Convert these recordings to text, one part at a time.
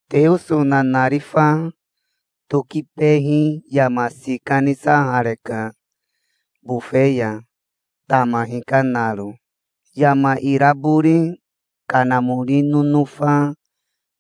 Teoso nanarifa tokibehi yama sika nisahareka bofe ya, tama hikanaro. Yama irabori kanamori nonofa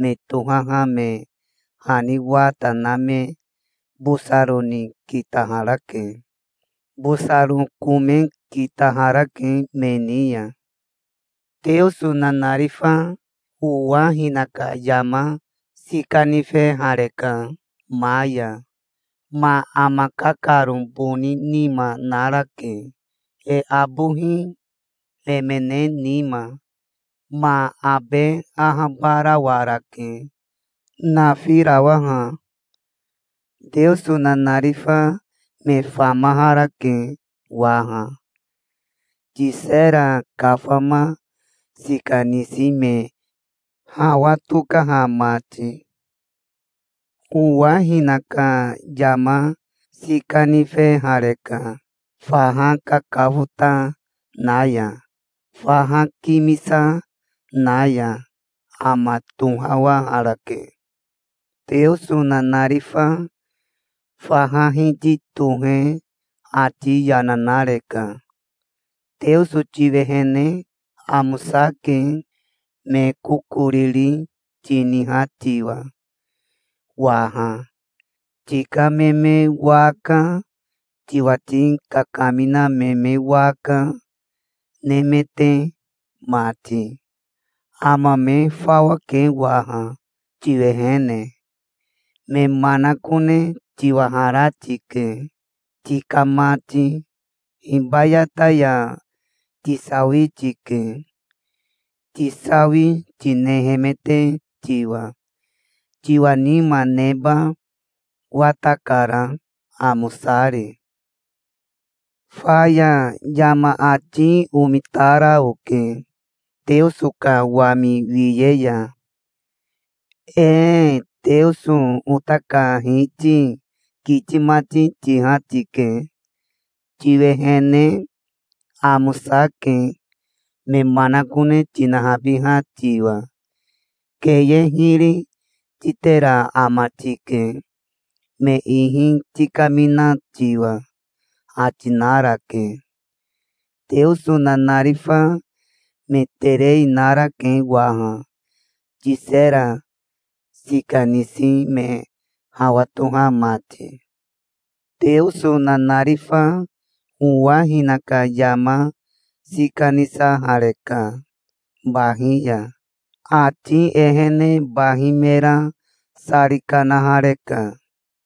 me tohaha me hani wata na me bosaro ni kitaharake. Bosaro kome kitaharake me ni ya. Teoso nanarifa owa hinaka yama sika nifehareka ma ya. Ma ama kakaro boni nima narake, e abohi emene nima. Ma abe ahabarawarake, nafirawaha. Teoso nanarifa me famaharake waha, tisera kafama sika nisi me hawa tokaha mati. Owa hinaka yama sika nifehareka faha kakafota na ya, faha kimisa na ya. Ama tohawaharake. Teoso nanarifa faha hiti tohe ati yana nareka. "Teoso tiwehene amosake, me kokoriri tiniha tiwa waha, tika me me waka, tiwati kakamina me me waka, nemete mati. Ama me fawake waha, tiwehene. Me manakone tiwahara tike, tika mati. Hibayata ya tisawi tike, tisawi tinehemete tiwa. Tiwa nima neba watakara, amosari". Faya yama ati omitara oke Teoso ka wami wiye ya. "Ee Teoso ota ka Hiti, kiti mati tiha tike. Tiwehene amosake, me manakone tinahabiha tiwa. Keye hiri titera ama tike me ihi tikamina tiwa", ati narake. Teoso nanarifa me terei narake waha, tisera sika nisi me hawa toha mati. Teoso nanarifa owa hinaka yama sika nisahareka bahi ya. Ati ehene bahi mera sari kanahareka.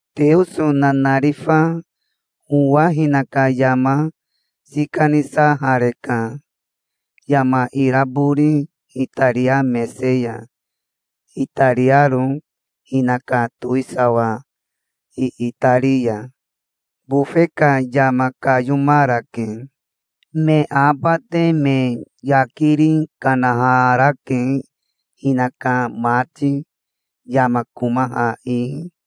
Teoso nanarifa owa hinaka yama sika nisahareka yama irabori itaria mese ya itariaro hinaka towisawa iitari ya. Bofe ka yama kayomarake. Me abate me yakiri kanaharake, hinaka mati, yama komaha ihi.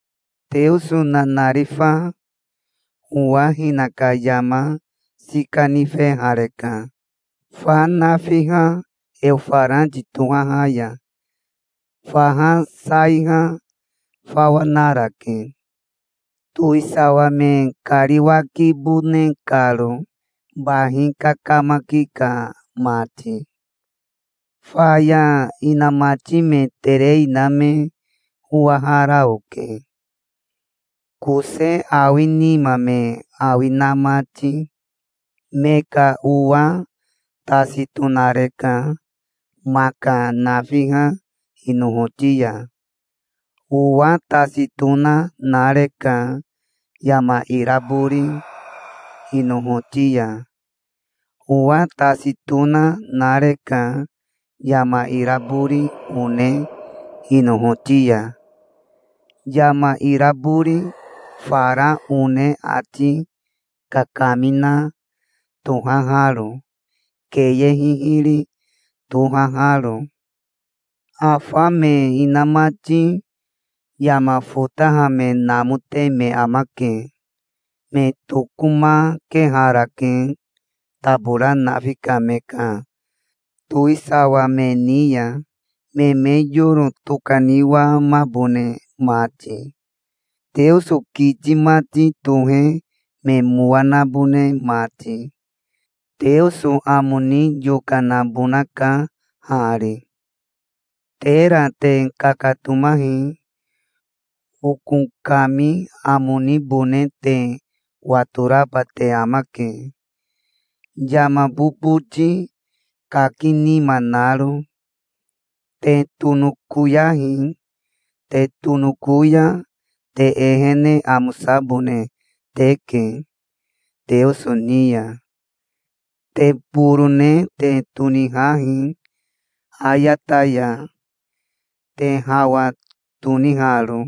Teoso nanarifa owa hinaka yama sika nifehareka fa nafiha Eofarati tohaha ya. Faha saiha fawa narake, towisawa me kariwakibone karo, bahi kakamaki ka mati. Faya inamati me terei na me owahara oke, kose awi nima me awi na mati. Me ka owa tasi tonareka maka nafiha inohoti ya. Owa tasi tona nareka yama irabori inohoti ya. Owa tasi tona nareka yama irabori one inohoti ya, yama irabori fara one ati kakamina tohaharo, keye hihiri tohaharo. Afa me inamati yama fotaha me namote me amake. Me tokomakeharake tabora nafi ka me ka towisawa me ni ya, me me yoro tokaniwamabone mati, Teoso kiti mati tohe me mowa nabone mati. Teoso amo ni yokanabonaka hari. "Tera te kakatomahi. Oko kami amo nibone te watoraba te amake, yama boboti kaki nima naro. Te tonokoyahi. Te tonoko ya te ehene amosabone teke Teoso ni ya. Te borone te tonihahi ayata ya, te hawa toniharo.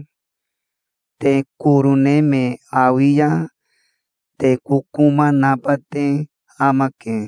Te korone me awi ya te kokoma naba te amake".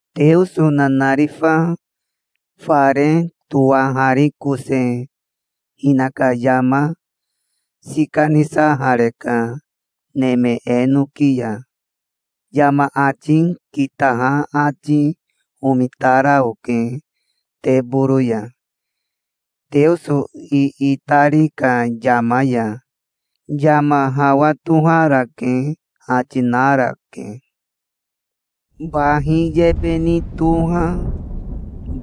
Teoso nanarifa fare towaharikose hinaka yama sika nisahareka neme enoki ya. Yama ati kitaha ati omitara oke teboro ya, Teoso iitari ka yama ya. "Yama hawa toharake", ati narake. Bahi yebe ni toha,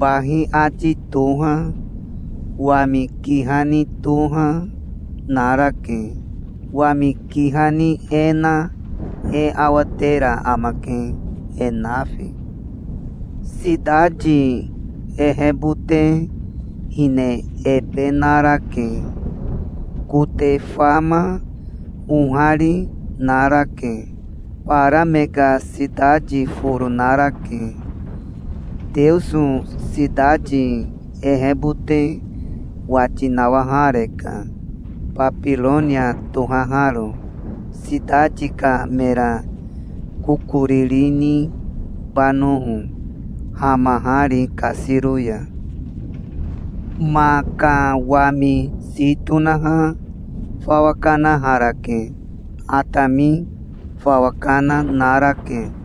bahi ati toha, wami kiha ni toha, narake. Wami kiha ni e na e awatera amake, e nafi. Sitati ehebote hine ebe narake. Kote fama, ohari narake. Bara me ka sitati foro narake. Teoso sitati ehebote wati nawahareka, Babironia tohaharo, sitati ka mera kokoriri nibanoho, hamahari kasiro ya. Ma ka wami si tonaha fawa kanaharake. Atami fawa kana narake.